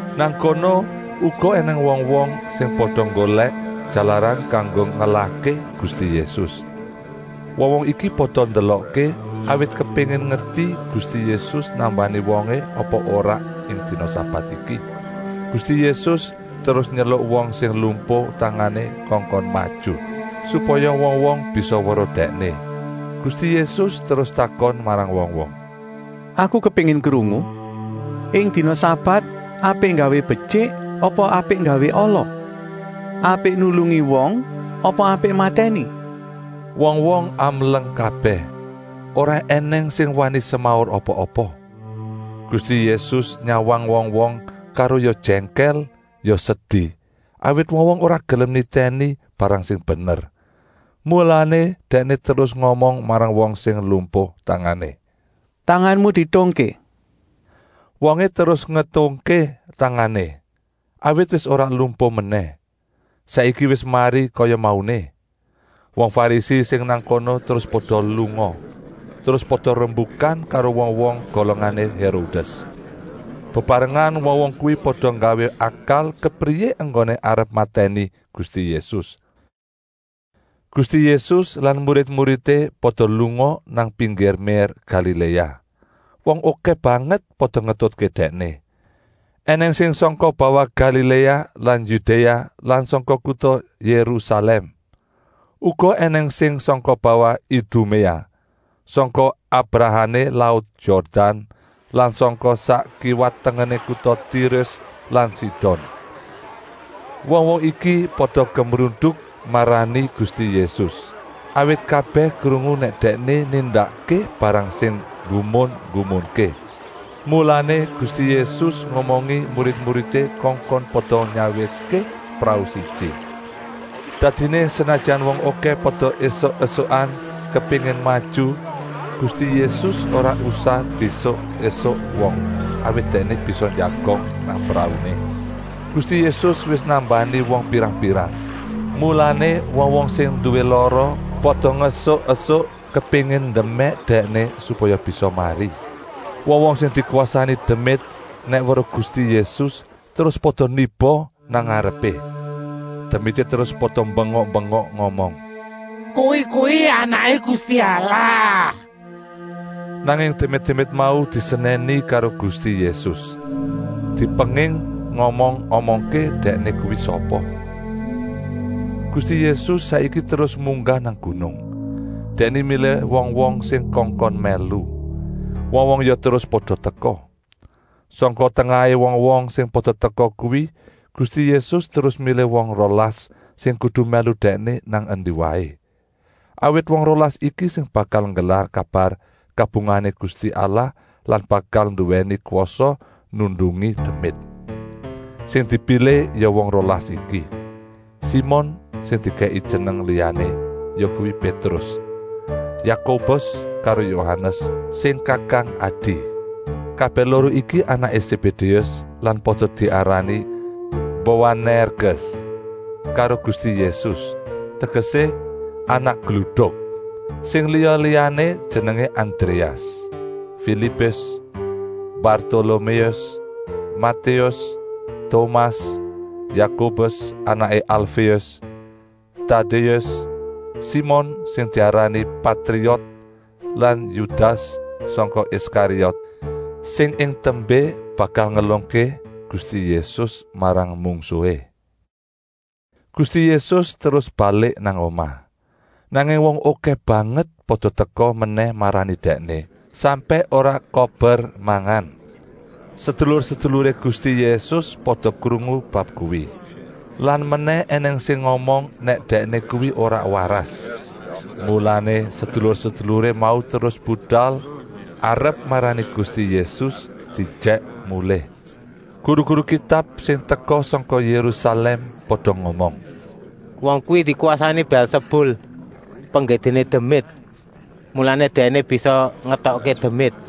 Nang kono uga ènèng wong-wong sing pada nggolèk jalaran kanggo ngelahké Gusti Yésus. Wong-wong iki pada ndelokké, awit kepéngin ngerti Gusti Yésus nambani wongé apa ora ing dina sabat iki. Gusti Yésus terus nyeluk wong sing lumpuh tangané kongkon maju, supaya wong-wong bisa weruh dèkné. Gusti Yésus terus takon marang wong-wong: “Aku kepéngin krungu: ing dina sabat apik nggawé betyik apa apik nggawé ala? Apik nulungi wong apa apik matèni?” Wong-wong amleng kabèh, ora ènèng sing wani semaur apa-apa. Gusti Yésus nyawang wong-wong karo ya jèngkèl ya sedi, awit wong-wong ora gelem nitèni barang sing bener. Mulané Dèkné terus ngomong marang wong sing lumpuh tangané: “Tanganmu dietungké!” Wongé terus ngetungké tangané, awit wis ora lumpuh menèh. Saiki wis mari kaya mauné. Wong Farisi sing nang kono terus pada lunga. Terus pada rembukan karo wong-wong golongané Hérodès. Bebarengan wong-wong kuwi pada nggawé akal kepriyé enggoné arep matèni Gusti Yésus. Gusti Yésus lan murid-muridé pada lunga nang pinggir mér Galiléa. Wong okèh banget pada ngetutké Dèkné. Enèng sing sangka bawah Galiléa lan Yudéa lan sangka kuta Yérusalèm. Uga ènèng sing sangka bawah Iduméa, sangka abrahané laut Yordan lan sangka sak kiwa-tengené kuta Tirus lan Sidon. Wong-wong iki pada gemruduk marani Gusti Yésus, awit kabèh krungu nèk Dèkné nindakké barang sing nggumun-nggumunké. Mulané Gusti Yésus ngomongi murid-muridé kongkon pada nyawiské prau siji. Dadiné senajan wong okèh pada esuk-esukan kepéngin maju, Gusti Yésus ora usah diesuk-esuk wong, awit Dèkné bisa njagong nang prauné. Gusti Yésus wis nambani wong pirang-pirang, mulané wong-wong sing nduwé lara pada ngesuk-esuk, kepéngin ndemèk Dèkné supaya bisa mari. Wong-wong sing dikwasani demit nèk weruh Gusti Yésus terus pada niba nang ngarepé. Demité terus pada bengok-bengok ngomong: “Kowé kuwi Anaké Gusti Allah!” Nanging demit-demit mau disenèni karo Gusti Yésus, dipenging ngomong-omongké Dèkné kuwi sapa. Gusti Yésus saiki terus munggah nang gunung. Dèkné milih wong-wong sing kongkon mèlu. Wong-wong ya terus pada teka. Sangka tengahé wong-wong sing pada teka kuwi Gusti Yésus terus milih wong rolas sing kudu mèlu Dèkné nang endi waé. Awit wong rolas iki sing bakal nggelar kabar kabungahané Gusti Allah lan bakal nduwèni kwasa nundungi demit. Sing dipilih ya wong rolas iki: Simon sing dikèki jeneng liyané, yakuwi Pétrus, Yakobus karo Yohanes sing kakang-adi. Kabèh loro iki anaké Sébédéus lan pada diarani Boanèrges karo Gusti Yésus, tegesé: anak gluduk. Sing liya-liyané jenengé Andréas, Filipus, Bartoloméus, Matéus, Tomas, Yakobus anaké Alféus, Tadéus, Simon sing diarani Patriot lan Yudas sangka Iskariot, sing ing tembé bakal ngelungké Gusti Yésus marang mungsuhé. Gusti Yésus terus balik nang omah. Nanging wong okèh banget pada teka menèh marani Dèkné, sampèk ora kober mangan. Sedulur-seduluré Gusti Yésus pada krungu bab kuwi. Lan menèh ènèng sing ngomong nèk Dèkné kuwi ora waras. Mulané sedulur-seduluré mau terus budal arep marani Gusti Yésus diejèk mulih. Guru-guru Kitab sing teka sangka Yérusalèm pada ngomong: “Wong kuwi dikwasani Bèlsebul, penggedéné demit. Mulané Dèkné bisa ngetokké demit.”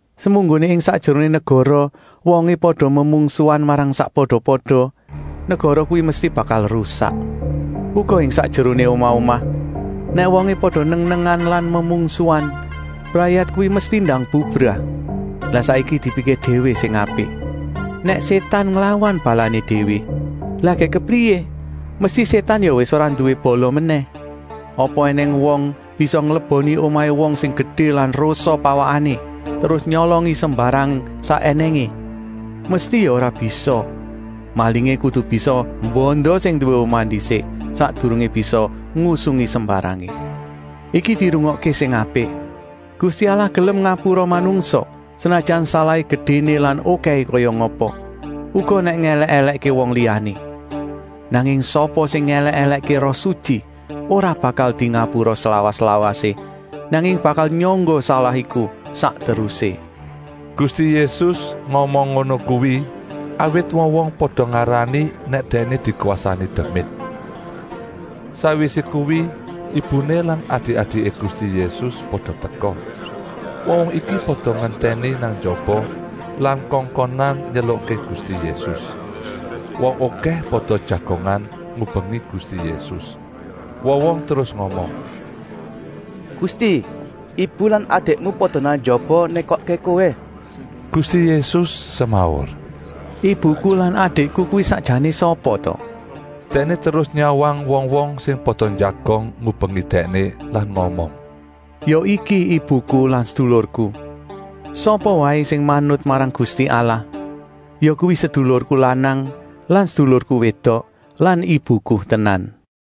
Semunggoné ing sakjeroné negara wongé pada memungsuhan marang sakpada-pada, negara kuwi mesti bakal rusak. Uga ing sakjeroné omah-omah, nèk wongé pada neng-nengan lan memungsuhan, brayat kuwi mesti ndang bubrah. Lah saiki dipikir déwé sing apik: nèk Sétan nglawan balané déwé, lah gèk kepriyé? Mesti Sétan ya wis ora nduwé bala menèh. “Apa ènèng wong bisa ngleboni omahé wong sing gedé lan rosa pawakané, terus nyolongi sembarang sak ènèngé? Mesti ya ora bisa! Malingé kudu bisa mbanda sing nduwé omah ndisik, sakdurungé bisa ngusungi sembarangé. “Iki dirungokké sing apik. Gusti Allah gelem ngapura manungsa, senajan salahé gedéné lan okèhé kaya ngapa, uga nèk ngèlèk-èlèkké wong liyané. Nanging sapa sing ngèlèk-èlèkké Roh Sutyi ora bakal dingapura slawas-lawasé, nanging bakal nyangga salah iku sak terusé.” Gusti Yésus ngomong ngono kuwi, awit wong-wong pada ngarani nèk Dèkné dikwasani demit. Sakwisé kuwi ibuné lan adik-adiké Gusti Yésus pada teka. Wong-wong iki pada ngentèni nang njaba lan kongkonan nyelukké Gusti Yésus. Wong okèh pada jagongan ngubengi Gusti Yésus. Wong-wong terus ngomong: “Gusti, ibu lan adikmu pada nang njaba nékokké Kowé!” Gusti Yésus semaur: “Ibuku lan adikku kuwi sakjané sapa ta?” Dèkné terus nyawang wong-wong sing pada njagong ngubengi Dèkné lan ngomong: “Ya iki ibuku lan sedulurku. Sapa waé sing manut marang Gusti Allah, yakuwi sedulurku lanang lan sedulurku wédok lan ibuku tenan.”